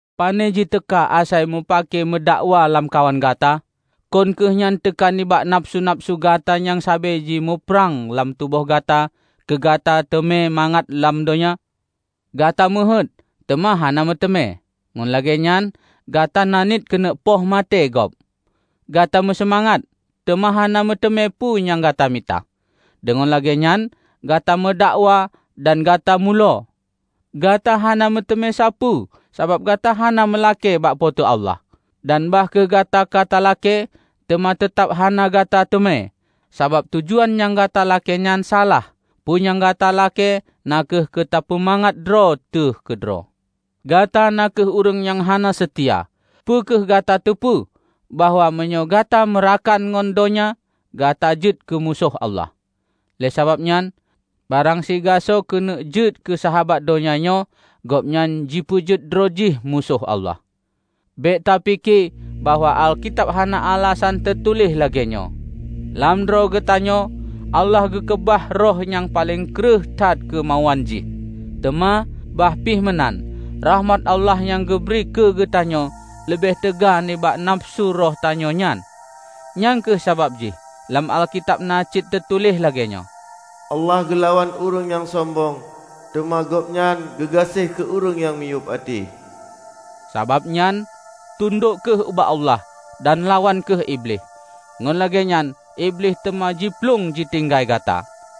Pane jiteuka asai mupake meudakwa lamkawan gata? Kon kheueh nyan teuka nibak nafeusu-nafeusu gata nyang sabe jimuprang lam tuboh gata keu gata teumé mangat lam donya! Gata meuheuét, teuma hana meuteumé, ngon lagée nyan gata naniet keuneuk peumaté gob! Gata meuseumangat, teuma hana meuteumé peue nyang gata mita, deungon lagée nyan gata meudakwa dan gata mulo. Gata hana meuteumé sapeue, sabab gata hana meulakée bak Po teu Allah. Dan bah kheueh gata ka talakée, teuma teutab hana gata teumé, sabab tujuan nyang gata lakée nyan salah; peue nyang gata lakée na kheueh keu tapeumangat droe teuh keudroe. Gata na kheueh ureuëng nyang hana seutia! Peu kheueh gata teupeue bahwa meunyoe gata meurakan ngon donya, gata jeuet keumusoh Allah? Lé sababnyan, barang sigasoe keuneuk jeuet keu sahabat donya nyoe, gobnyan jipeujeuet droe jih musoh Allah. Bék tapike bahwa Alkitab hana alasan teutuléh lagée nyoe, "Lam droe geutanyoe Allah geukeubah roh nyang paleng kreueh that keumauan jih." Teuma bahpi meunan, rakhmat Allah nyang geubri keugeutanyoe leubeh teuga nibak nafeusu roh tanyoe nyan. Nyang kheueh sabab jih lam Alkitab na cit teutuléh lagée nyoe, "Allah geulawan ureuëng nyang sombong, teuma gobnyan geugaséh keu ureuëng nyang miyueb até." Sabab nyan, tundok kheueh ubak Allah dan lawan kheueh Iblih, ngon lagée nyan Iblih teuma jiplueng jitinggai gata.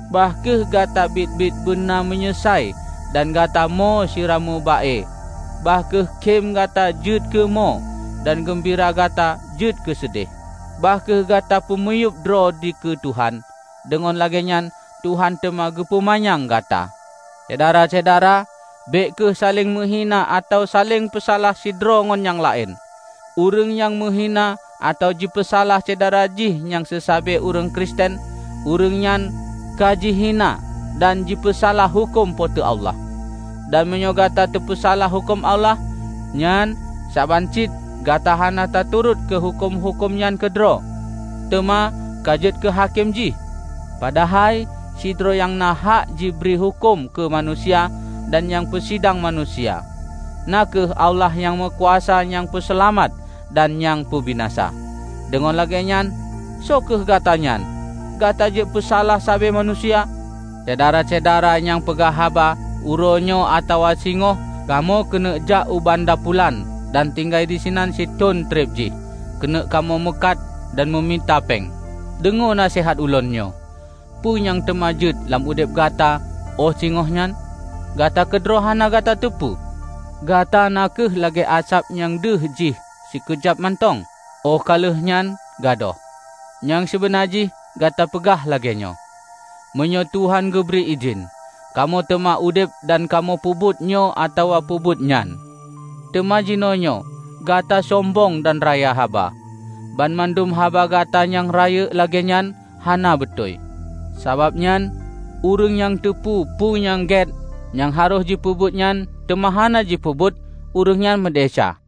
Bah kheueh gata biet-biet beuna meunyeusai dan gata mo sira meuba-e; bah kheueh khem gata jeuet keu mo dan geumbira gata jeuet keuseudeh! Bah kheueh gata peumiyueb droe dikeue Tuhan, deungon lagée nyan Tuhan teuma geupeumanyang gata. Syedara-syedara, bék kheueh saléng meuhina atawa saléng peusalah sidroe ngon nyang laén. Ureuëng nyang meuhina atawa jipeusalah syedara jih nyang seusabe ureuëng Kristen, ureuëng nyan ka jihina dan jipeusalah huköm Po teu Allah. Dan meunyoe gata tapeusalah huköm Allah, nyan saban cit gata hana taturot keu huköm-huköm nyan keudroe, teuma ka jeuet keuhakém jih. Padahai sidroe nyang na hak jibri huköm keu manusia dan nyang peusidang manusia. Na kheueh Allah nyang meukuasa nyang peuseulamat dan nyang peubinasa. Deungon lagée nyan, soe kheueh gata nyan, gata jeuet peusalah sabe manusia? Syedara-syedara nyang peugah haba, "Uroe nyoe atawa singoh kamoe keuneuk jak u banda pulan dan tinggai disinan sithon treb jih keuneuk kamoe meukat dan meumita péng," -- deungoe naseuhat ulôn nyoe. Peue nyang teuma jeuet lam udeb gata óh singoh nyan, gata keudroe hana gata teupeue! Gata na kheueh lagée asab nyang deuh jih sikeujab mantong, óh ka lheueh nyan gadôh. Nyang sibeuna jih gata peugah lagée nyoe, "Meunyoe Tuhan geubri idhin, kamoe teuma udeb dan kamoe peubuet nyoe atawa meupeubuet nyan." Teuma jinoenyoe gata sombong dan raya haba. Banmandum haba gata nyang rayeuk lagée nyan hana beutôi. Sabab nyan, ureuëng nyang teupeue peue nyang gét nyang harôh jipeubuet nyan teuma hana jipeubuet, ureuëng nyan meudesya.